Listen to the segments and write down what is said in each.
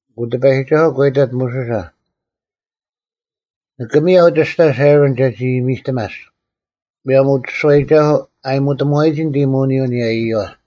ᐊᑯ ᑎᐸᔨᒋᒐᓱᐤ ᒂ ᐃᑕᑦ ᒧᓱᓴ, “ᓂᑭ ᒥᔭᐤ ᒋᔅᑕᔅ ᐊᕋᓐ ᒐᒋ ᐃᔨᒥᔅᑎᒪᔅᒃ, ᒧᔭᒻ ᐅᒋᔅᒋᐛᐃᒐᓱᐤ ᐊᔨᒧᑎᒧᐛᒋ ᓂᑦ ᐃᔨᒧᓂᔪᐤ ᐊᓂᔭ ᐃᔪᐛ᙮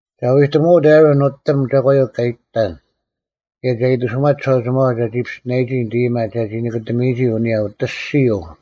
ᒐ ᐎᑎᒧᐅᑦ ᐊᕋᓐ ᓄᑎᒻ ᒐᒂᔪᐤ ᑲ ᐃᑎᑕᓐ ᑭᔭ ᒐ ᐃᑎᓱᒪᑦ ᒋᓴᐅᒋᒪᐛ ᒐᒋ ᐱᔅᑎᓇᔨᒋ ᓂᑦ ᐃᔨᒪ ᒐᒋ ᓂᑭᑎᒥᔨᒋ ᐊᓂᔭ ᐅᑦ ᐊᔅᒋᔪᐤ᙮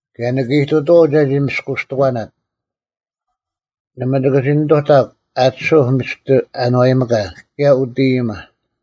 ᑭᔭ ᓂᑭ ᐃᑐᑐᐛᐤ ᒐᒋ ᒥᔅᑯᔅᑎᒂᓇᑦ᙮ ᓇᒪ ᒋᑭ ᓂᑐᑕᒃ ᐊᑎᓱᐧᒄ ᒥᔅᑎ ᐊᓏᔨᒥᑲ ᑭᔭ ᐅᑦ ᐃᔨᒪ᙮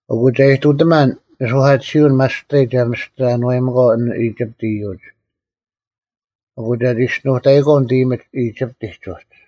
ᐊᑯ ᒐ ᐃᑐᑎᒪᓐ ᓂᓱᐧᑲᑎᓯᐅᓐ ᒪᔅᑕᔾ ᒐ ᒥᔅᑎ ᐊᓏᔨᒥᒂᐤ ᐊᓐ ᐃᒋᑉᑦ ᐃᔪᒡ, ᐊᑯ ᒐ ᒋᔅᒋᓄᑕᐃᒂᐤ ᓂᑦ ᐃᔨᒥᒡ ᐃᒋᑉᑎᒡ ᐅᒡ᙮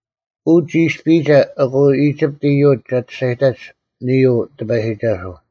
ᐅ ᒋ ᐃᔅᐱᔨᒐ ᐊᑯ ᐃᒋᑉᑦ ᐃᔪᒡ ᒐ ᒋᔅᒐᔨᑕᒡ, ᓂᔾ ᐅ ᑎᐸᔨᒋᒐᓱᐤ᙮”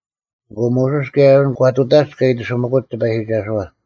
ᐊᑯ ᒧᓱᔅ ᑭᔭ ᐊᕋᓐ ᒂ ᑐᑕᒡ ᑲ ᐃᑎᓱᒪᑯᒡ ᑎᐸᔨᒋᒐᓱᐛ᙮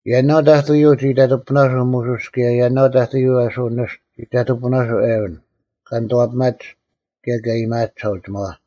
ᔭᓇᐤ ᑕᑐᔪᐤ ᒋ ᐃᑕᑐᐳᓇᓱᐤ ᒧᓱᔅ ᑭᔭ ᔭᓇᐤ ᑕᑐᔪᐤ ᐊᓱ ᓂᔅᑐ ᒋ ᐃᑕᑐᐳᓇᓱᐤ ᐊᕋᓐ, ᑲ ᓂᑐᐛᐱᒪᒡ ᑭᔭ ᑲ ᐃᔨᒪᐊᒡ ᒋᓴᐅᒋᒪᐛ᙮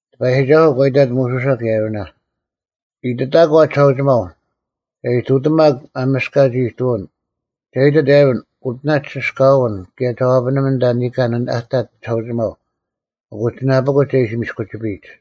ᑎᐸᔨᒋᒐᓱᐤ ᒂ ᐃᑕᑦ ᒧᓱᓴ ᑭᔭ ᐊᕋᓇ, “ᐃᑎᑕᒂ ᒋᓴᐅᒋᒪᐤ, ‘ᒐ ᐃᑐᑎᒪᒄ ᒪᒥᔅᑲᒡ ᐃᑐᐅᓐ,’ ᒐ ᐃᑎᑦ ᐊᕋᓐ, ‘ᐅᑎᓇ ᒋᓯᔅᑲᐅᓐ ᑭᔭ ᒐ ᐛᐱᓂᒥᓐ ᐊᓐᑕ ᓂᑲᓐ ᐊᑕᑦ ᒋᓴᐅᒋᒪᐤ ᐊᑯ ᒋᓇᐱᑯᒡ ᒐ ᐃᓯ ᒥᔅᑯᒋᐱᔨᒡ᙮’”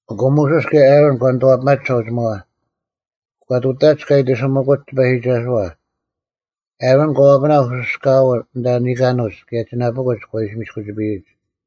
ᐊᑯ ᒧᓱᔅ ᑭᔭ ᐊᕋᓐ ᒂ ᓂᑐᐛᐱᒪᒡ ᒋᓴᐅᒋᒪᐛ, ᒂ ᑐᑕᒡ ᑲ ᐃᑎᓱᒪᑯᒡ ᑎᐸᔨᒋᒐᓱᐛ᙮ ᐊᕋᓐ ᒂ ᐛᐱᓇᐧᒃ ᐅᓯᔅᑲᐅᓐ ᐊᓐᑕ ᓂᑲᓄᒡ ᑭᔭ ᒋᓇᐱᑯᒡ ᒂ ᐃᓯ ᒥᔅᑯᒋᐱᔨᒡ᙮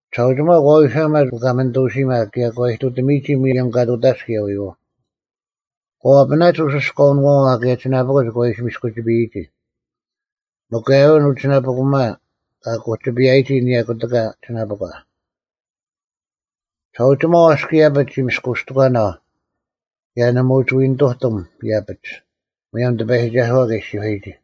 ᒋᓴᐅᒋᒪᐤ ᒂ ᐎᓴᒪᑦ ᐅᑲᒥᓂᑐᐅᓯᒪ ᑭᔭ ᒂ ᐃᑐᑎᒥᔨᒋ ᒧᔭᒻ ᑲ ᑐᑕᒡ ᑭᔭ ᐎᔨᐛᐤ᙮ ᒂ ᐛᐱᓇᒡ ᐅᓯᔅᑲᐅᓄᐛᐛ ᑭᔭ ᒋᓇᐱᑯᒡ ᒂ ᐃᓯ ᒥᔅᑯᒋᐱᔨᒋ, ᒥᒄ ᐊᕋᓐ ᐅ ᒋᓇᐱᑯᒪ ᑲ ᑯᒋᐱᔭᔨᒋ ᐊᓂᔭ ᑯᑎᑲ ᒋᓇᐱᒂ᙮ ᒋᓴᐅᒋᒪᐤ ᐊᔅᒄ ᐃᔭᐱᒡ ᒋ ᒥᔅᑯᔅᑎᒂᓇᐤ ᑭᔭ ᓇᒪ ᐅᒋ ᐎᓂᑐᑎᒻ ᐃᔭᐱᒡ, ᒧᔭᒻ ᑎᐸᔨᒋᒐᓱᐛ ᑲ ᐃᔅᒋᔄᔨᒋ᙮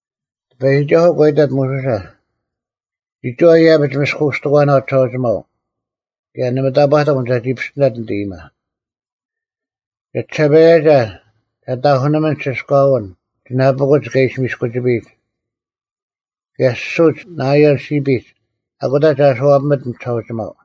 ᑎᐸᔨᒋᒐᓱᐤ ᒂ ᐃᑕᑦ ᒧᓱᓴ, “ᒋᒋᐛ ᐃᔭᐱᒡ ᒥᔅᑯᔅᑎᒂᓇᐤ ᒋᓴᐅᒋᒪᐤ, ᑭᔭ ᓇᒪ ᑕᑈᑎᒻ ᒐᒋ ᐱᔅᑎᓇᑦ ᓂᑦ ᐃᔨᒪ᙮ ᒐᒋᓴᐸᔭᒐ, ᒐ ᑕᐧᑯᓂᒥᓐ ᒋᓯᔅᑲᐅᓐ ᒋᓇᐱᑯᒡ ᑲ ᐃᓯ ᒥᔅᑯᒋᐱᔨᒡ, ᑭᔭ ᓯᓱᒡ ᓇᐃᔭᓪ ᓯᐱᒡ, ᐊᑯᑕ ᒐ ᐊᓱᐛᐱᒥᑦ ᐊᓐ ᒋᓴᐅᒋᒪᐤ᙮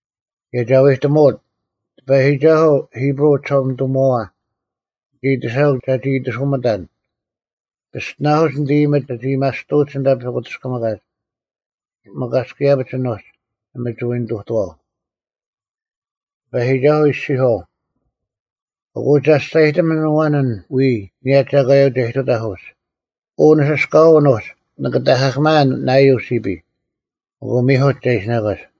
ᑭᔭ ᒐ ᐎᑎᒧᐅᑦ, ‘ᑎᐸᔨᒋᒐᓱᐤ, ᐃᑉᕈᐤ ᐅᒋᓴᒪᓂᑐᒧᐛᐛ, ᓂᒋ ᐃᑎᓴᐅᒃ ᒐᒋ ᐃᑎᓱᒥᑕᓐ, ᐱᔅᑎᓇᐧᑯᒡ ᓂᑦ ᐃᔨᒥᒡ ᒐᒋ ᐊᔭᒥᐊᔅᑐᐅᒡ ᐊᓐᑕ ᐸᐧᑯᑎᔅᑭᒥᑲᒡ᙮ ᒥᒄ ᐊᔅᒄ ᐃᔭᐱᒡ ᐊᓄᒡ, ᓇᒪ ᒋ ᐅᒋ ᓂᑐᑐᐛᐤ᙮ ᑎᐸᔨᒋᒐᓱᐤ ᐃᔅᒋᔄᐤ, “ᐊᑯ ᒐᔅᒐᔨᑎᒥᓐ ᐊᐛᓐ ᐊᓐ ᐎᔾ ᐊᓂᔭ ᒐᒂᔪᐤ ᒐ ᐃᑐᑕᐧᒃ ᐅᒡ: ᐅ ᓂᓯᔅᑲᐅᓐ ᐅᒡ ᓂᑭ ᑕᐧᑲᑭᒪᐊᓐ ᓇᐃᔭᓪ ᓯᐱᔾ, ᐊᑯ ᒥᐧᑯᒡ ᒐ ᐃᓯᓇᒂᒡ᙮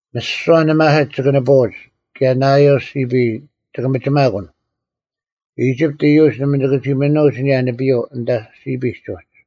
ᒥᓯᐛ ᓂᒪᓯᒡ ᒋᑭ ᓂᐳᐅᒡ, ᑭᔭ ᓇᐃᔭᓪ ᓯᐱᔾ ᒋᑭ ᒥᒋᒪᑯᓐ᙮ ᐃᒋᑉᑦ ᐃᔪᒡ ᓇᒪ ᒋᑭ ᒋ ᒥᓄᐅᒡ ᐊᓂᔭ ᓂᐱᔪᐤ ᐊᓐᑕ ᓯᐱᒡ ᐅᒡ᙮”’”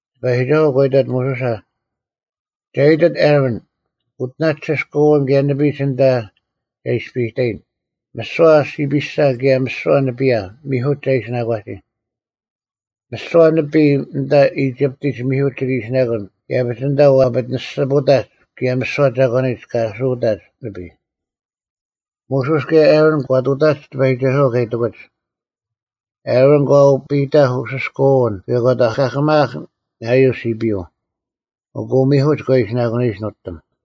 ᑎᐸᔨᒋᒐᓱᐤ ᒂ ᐃᑕᑦ ᒧᓱᓴ, “ᒐ ᐃᑎᑦ ᐊᕋᓐ, ‘ᐅᑎᓇ ᒋᓯᔅᑲᐅᓐ ᑭᔭ ᓂᐱᒡ ᐊᓐᑕ ᒐ ᐃᔅᐱᑕᔨᓐ, ᒥᓯᐛ ᓯᐱᓴ, ᑭᔭ ᒥᓯᐛ ᓂᐱᔭ,’ ᒥᐧᑯᒡ ᒐ ᐃᓯᓇᒂᒋ᙮ ᒥᓯᐛ ᓂᐱᔾ ᐊᓐᑕ ᐃᒋᑉᑎᒡ ᒥᐧᑯᒡ ᒋᑭ ᐃᓯᓇᑯᓐ ᐃᔭᐱᒡ ᐊᓐᑕ ᐛᐱᑎᓂᔅᒋᐳᑕᒡ ᑭᔭ ᒥᓯᐛ ᒐᒂᓂᒡ ᑲ ᐊᓱᐅᑕᒡ ᓂᐱᔾ᙮” ᒧᓱᔅ ᑭᔭ ᐊᕋᓐ ᒂ ᑐᑕᒡ ᑎᐸᔨᒋᒐᓱᐛ ᑲ ᐃᑎᑯᒡ᙮ ᐊᕋᓐ ᒂ ᐅᐱᑕᐧᒃ ᐅᓯᔅᑲᐅᓐ ᑭᔭ ᒂ ᑕᐧᑲᑭᒪᐊᐧᒃ ᓇᐃᔭᓪ ᓯᐱᔪᐤ, ᐊᑯ ᒥᐧᑯᒡ ᒂ ᐃᓯᓇᑯᓂᔨᒡ ᓄᑎᒻ ᓂᐱᔪᐤ᙮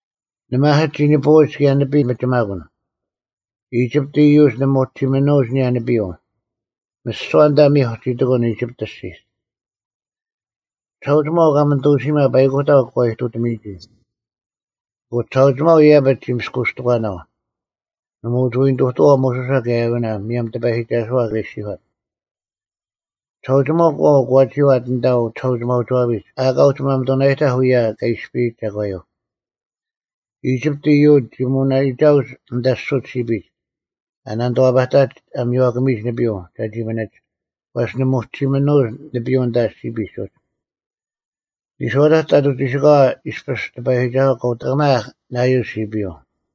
ᓂᒪᓯᒡ ᒋ ᓂᐳᐅᒡ ᑭᔭ ᓂᐱᔾ ᒋᑭ ᒥᒋᒪᑯᓐ, ᐃᒋᑉᑦ ᐃᔪᒡ ᓇᒪ ᒋ ᐅᒋ ᒥᓄᐅᒡ ᐊᓂᔭ ᓂᐱᔪᐤ᙮ ᒥᓯᐛ ᐊᓐᑕ ᒥᐧᒄ ᒋ ᑎᑯᓐ ᐃᒋᑉᑦ ᐊᔅᒋᒡ᙮ ᒋᓴᐅᒋᒪᐤ ᐅᑲᒥᓂᑐᓯᒪ ᐸᐃᑯᑕᐤ ᒂ ᐃᑐᑎᒥᔨᒋ᙮ ᐊᑯ ᒋᓴᐅᒋᒪᐤ ᐃᔭᐱᒡ ᒋ ᒥᔅᑯᔅᑎᒂᓇᐤ, ᓇᒪ ᐅᒋ ᐎ ᓂᑐᑐᐛᐤ ᒧᓱᓴ ᑭᔭ ᐊᕋᓇ ᒧᔭᒻ ᑎᐸᔨᒋᒐᓱᐤ ᑲ ᐃᔅᒋᔄᑦ᙮ ᒋᓴᐅᒋᒪᐤ ᑲᐤ ᒂ ᒋᐛᑦ ᐊᓐᑕ ᐅᒋᓴᒋᒪᐅᒋᐛᐱᒡ ᐊᑲ ᐅᒋ ᒪᒥᑐᓇᔨᑕᐧᒃ ᐅᔭ ᑲ ᐃᔅᐱᔨᒡ ᒐᒂᔪᐤ᙮ ᐃᒋᑉᑦ ᐃᔪᒡ ᒋ ᒧᓇᐃᒐᐅᒡ ᐊᓐᑕ ᓯᓱᒡ ᓯᐱᒡ ᐊ ᓇᓂᑐᐛᐸᑕᒡ ᐊ ᒥᔽᑭᒥᔨᒡ ᓂᐱᔪᐤ ᒐᒋ ᒥᓂᒡ, ᐛᔅ ᓇᒪ ᐅᒋ ᒥᓄᐅᒡ ᓂᐱᔪᐤ ᐊᓐᑕ ᓯᐱᒡ ᐅᒡ᙮ ᓂᔄᐅᑕᒡ ᑕᑐᐤ ᒋᓯᑲᐛ ᐃᔅᐱᔅ ᑎᐸᔨᒋᒐᓱᐤ ᑲ ᐅᑕᒪᑭᒪᐊᐧᒃ ᓇᐃᔭᓪ ᓯᐱᔪᐤ᙮